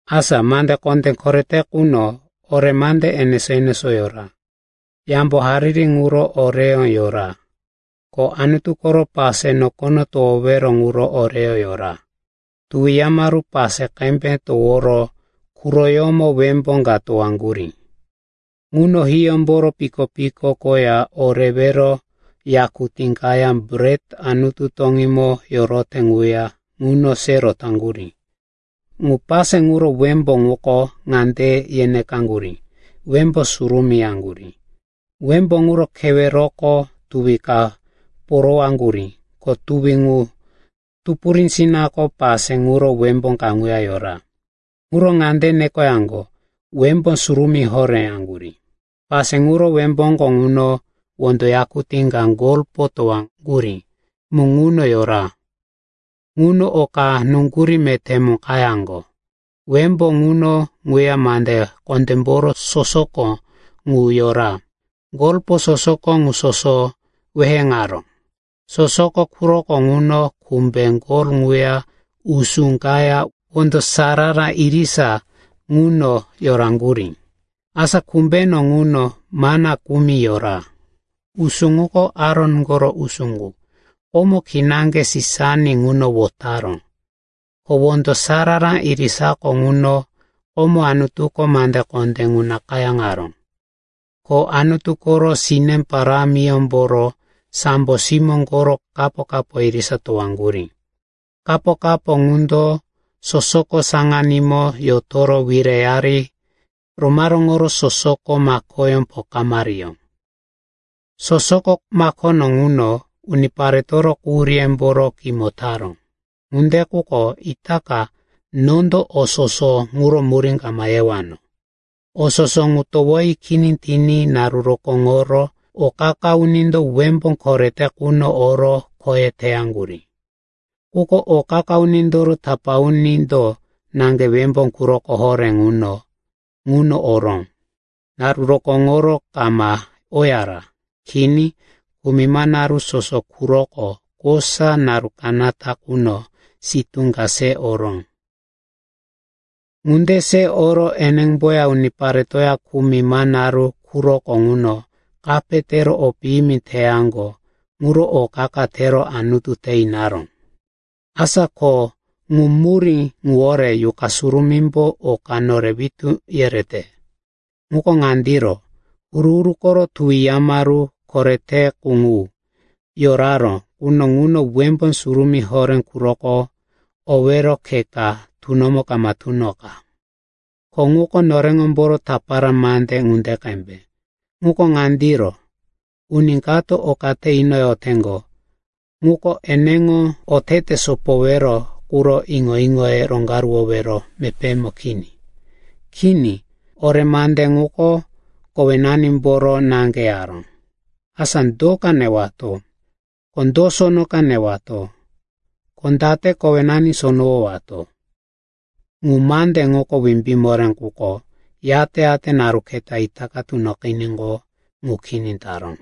Asa mande kondé korete quno ore mande enesó-enesó yora. Yambo hariri ŋuro oreyó yora, ko Anutu koro pase nokono towowero ŋuro oreyó yora. Tuwi yamaru pase qembe toworo quroyómo wembó ka towaŋgurí. Ŋuno hiyómboro piko-piko koya o rewero yakutí kaya bret Anutu toŋímo yorote ŋuya ŋuno se rotaŋgurí. Ŋu pase ŋuro wembó ŋuko ŋande ye nekaŋgurí, “Wembó Surumí,” yaŋgurí. Wembó ŋuro keweroko tuwi ka porowaŋgurí, ko tuwi ŋu tupurísinako pase ŋuro wembó kaŋuya yora. Ŋuro ŋande nekoyaŋgo, “Wembó Surumí Horé,” yaŋgurí. Pase ŋuro wembóko ŋuno wondo yakutí ka golpo towaŋgurí mu ŋuno yora. Ŋuno oka nuŋgurí meté mu qayaŋgo. Wembó ŋuno ŋuya mande kondémboro sosoko ŋu yora. Golpo sosoko ŋu soso weheŋaró. Sosoko quroko ŋuno kumbe gol ŋuya usú kaya wondo sarara irisa ŋuno yoraŋgurí. Asa kumbeno ŋuno mana kumi yora. Usú ŋuko Aron koro usú qu, komo kinaŋge sisani ŋuno wotaró. Ko wondo sarara irisako ŋuno komo Anutuko mande kondé ŋu nakayáŋaró. Ko Anutu koro sine parámiyómboro sambo simó koro kapo-kapo irisa towaŋgurí. Kapo-kapo ŋundo sosoko saŋanímo yotoro wireyari romaróŋoro sosoko makoyó pokamariyó. Sosoko makono ŋuno uniparetoro quhuríyemboro kimo taró. Ŋunde quko itaka nondo o soso ŋuro murí kama yewano. O soso ŋu towoyi kini tiní naru rokóŋoro o qa-qa unindo wembó korete quno oro khoye teyaŋgurí. Quko o qa-qa unindoro tapá unindo naŋge wembó quroko horé quno ŋuno oró. Naru rokóŋoro kama oyara. Kini, kumima naru soso quroko kosa naru kanata quno sitú ka se oró. Ŋunde se oro enemboya uniparetoya kumima naru quroko ŋuno kape tero o piyimi teyaŋgo ŋuro o qa-qa tero Anutu te inaró. Asa ko ŋu murí ŋuwore Yuqa Surumímbo oka nore witú yerete. Ŋuko ŋandiro, Huru-huru koro Tuwi Yamaru korete qu ŋu yoraró quno ŋuno Wembó Surumí Horé quroko owero khe ka tunomo kama tunoqa. Ko ŋuko noreŋomboro tapara mande ŋunde qembe. Ŋuko ŋandiro, uni kato oka te inoyoteŋgo ŋuko eneŋo otete sopowero quro iŋo-iŋoye roŋgaruwowero mepémo kini. Kini, ore mande ŋuko kowenanimboro naŋge yaró, asa do ka newato, ko do sono ka newato, ko date kowenani sonowowato. Ŋu mande ŋuko wimbí moré, quko yate-yate naru keta itaka tunoqiníqo, ŋu kini taró.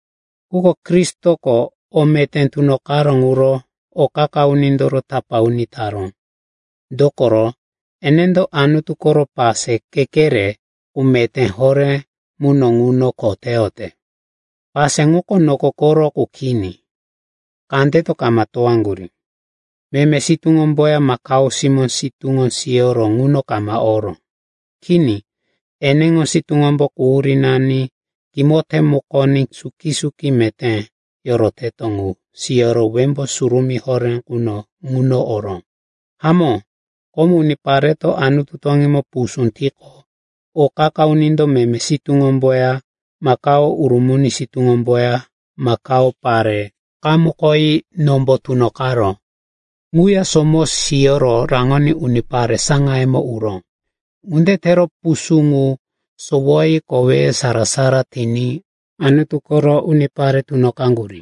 Quko Kristoko o meté tunoqaró ŋuro o qa-qa unindoro tapá uni taró. Dokoro enendo Anutu koro pase kekere qu meté horé muno ŋuno kho teyote. Pase ŋuko noko koro qu kini, kandeto kama towaŋgurí. Meme sitúŋomboya makao simó sitúŋo siyoro ŋuno kama oró. Kini, eneŋo sitúŋombo quhurínani kimo temukoní suki-suki meté yoroteto ŋu siyoro Wembó Surumí Horé quno ŋuno oró. Hamó, komo unipareto Anutu toŋímo pusú tiqo, o qa-qa unindo meme sitúŋomboya makao urumuni sitúŋomboya makao pare qamukoyi nombo tunoqaró ŋuya somo siyoro raŋoní unipare saŋayemo uró. Ŋunde tero pusú ŋu sowoyi koweye sara-sara tiní Anutu koro unipare tunoqaŋgurí.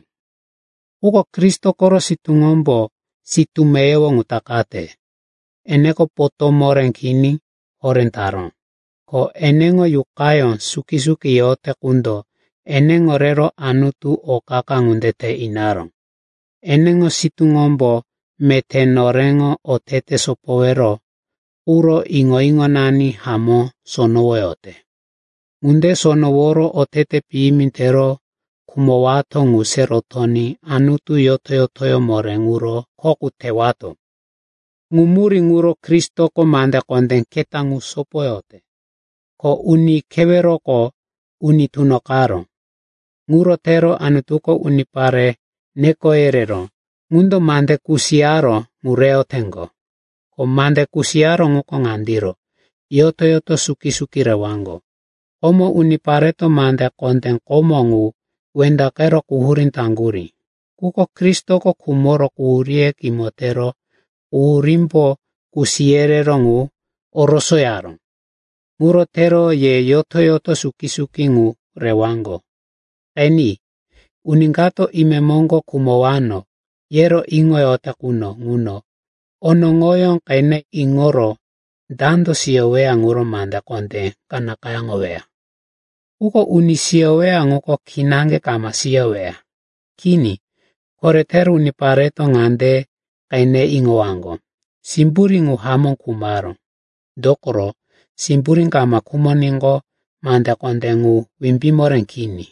Quko Kristo koro sitúŋombo sitú meyowo ŋu takate. Eneko potó moré kini horé taró. Ko eneŋo Yuqayó suki-suki yote qundo eneŋo rero Anutu o qa-qa ŋunde te inaró. Eneŋo sitúŋombo meté noreŋo otete sopowero quro iŋo-iŋonani hamó sonowoyote. Ŋunde sonoworo otete piyimi tero khumowato ŋu se rotoní Anutu yoto-yotoyó moré ŋuro kho qu tewato. Ŋu murí ŋuro Kristoko mande kondé keta ŋu sopoyote, ko uni keweroko uni tunoqaró. Ŋuro tero Anutuko unipare neko yereró ŋundo mande kusiyaró qu reyoteŋgo. Ko mande kusiyaró ŋuko ŋandiro, yoto-yoto suki-suki rewaŋgo. Komo unipareto mande kondé komo qu wendaqero quhurí taŋgurí. Quko Kristoko khumoro quhuríye kimo tero quhurímbo kusi yereró ŋu orosoyaró. Ŋuro tero ye yoto-yoto suki-suki ŋu rewaŋgo. Qeni, uni kato, imemoŋgo khumowano, yero iŋoyote quno ŋuno, onoŋoyó qene iŋoro dando siyoweya ŋuro mande kondé ka nakayáŋoweya. Quko uni siyoweya ŋuko kinaŋge kama siyoweya. Kini, koretero unipareto ŋande qene iŋowaŋgo, simburí ŋu hamó khumaró. Dokoro simburí kama khumoníqo, mande kondé ŋu wimbí moré kini.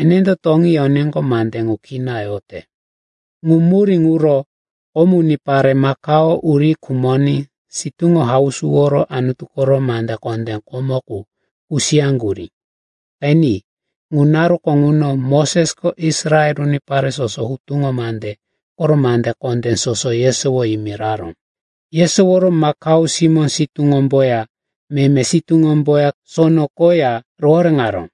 Enendo toŋí yoníqo mande ŋu kina yote. Ŋu murí ŋuro komo unipare makao uri khumoní sitúŋo hausuworo Anutu koro mande kondé komo qu kusiyaŋgurí. Qeni, ŋu naruko ŋuno Mosesko Israel unipare soso hutuŋo mande koro mande kondé soso yesowo yimiraró. Yesoworo makao simó sitúŋomboya meme sitúŋomboya sono koya rohoréŋaró.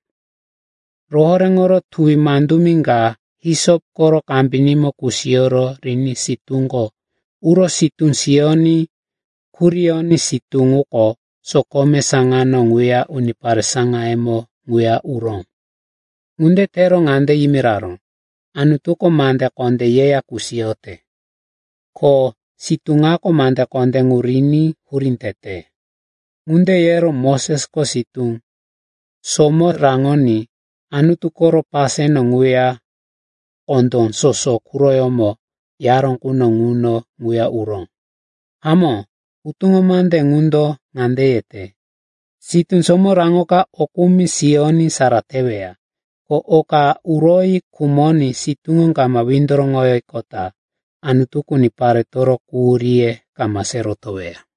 Rohoréŋoro tuwi mandumi ka hisop koro kambinímo kusiyoro riní sitúko uro sitú siyoní kuriyoní sitú ŋuko sokome saŋano ŋuya unipare saŋayemo ŋuya uró. Ŋunde tero ŋande yimiraró, “Anutuko mande kondé yeya kusiyote. Ko sitú ŋako mande kondé ŋu riní hurí tete.” Ŋunde yero Mosesko sitú somo raŋoní Anutu koro paseno ŋuya kondó soso quroyómo yaró quno ŋuno ŋuya uró. Hamó, hutuŋo mande ŋundo ŋande yete, sitú somo raŋoka o kumi siyoní sara teweya. Ko oka uroyi khumoní sitúŋo kama windoroŋoyiqota, Anutuko uniparetoro quhuríye kama se rotoweya.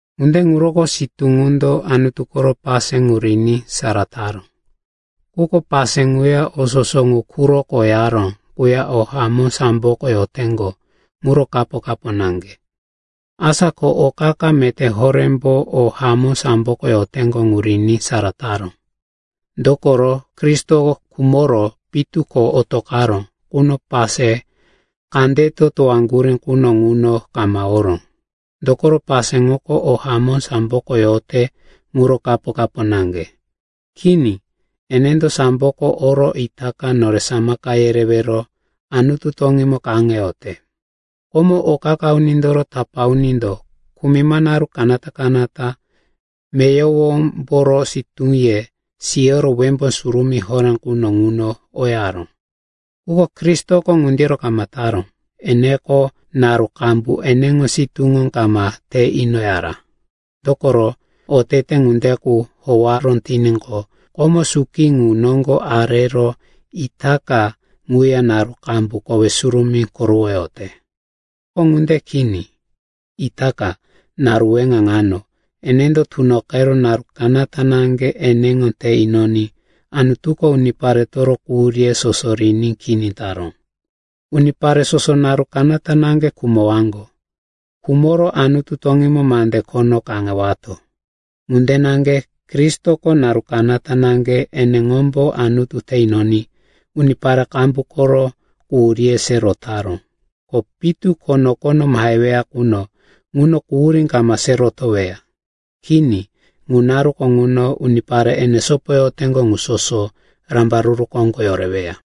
Ŋunde ŋuroko sitú ŋundo Anutu koro pase ŋu riní sara taró. Quko pase ŋuya o soso ŋu quroko yaró ŋuya o hamó samboko yoteŋgo ŋuro kapo-kapo naŋge. Asa ko o qa-qa meté horémbo o hamó samboko yoteŋgo ŋu riní sara taró. Dokoro Kristo khumoro pitu ko otoqaró quno pase kandeto towaŋgurí quno ŋuno kama oró. Dokoro pase ŋuko o hamó samboko yote ŋuro kapo-kapo naŋge. Kini, enendo samboko oro itaka nore samaka yerewero Anutu toŋímo kaŋeyote. Komo, o qa-qa unindoro tapá unindo kumima naru kanata-kanata meyowomboro sitúye siyoro Wembó Surumí Horé quno ŋuno oyaró. Quko Kristoko ŋundiro kama taró. Eneko naru qambu eneŋo sitúŋo kama te inoyara. Dokoro otete ŋunde qu howaró tiníqo, komo suki qu noŋgo arero itaka ŋuya naru qambu kowe surumí korowoyote. Quko ŋunde kini. Itaka, naru weŋa ŋano, enendo tunoqero naru kanata naŋge eneŋo te inoní Anutuko uniparetoro quhuríye soso riní kini taró. Unipare soso naru kanata naŋge khumowaŋgo. Khumoro Anutu toŋímo mande khono kaŋewato. Ŋunde naŋge Kristoko naru kanata naŋge eneŋombo Anutu te inoní unipare qambu koro quhuríye se rotaró. Ko pitu ko nokono maheweya quno ŋuno quhurí kama se rotoweya. Kini, ŋu naruko ŋuno unipare ene sopoyoteŋgo ŋu soso rambaruru koŋgo yoreweya.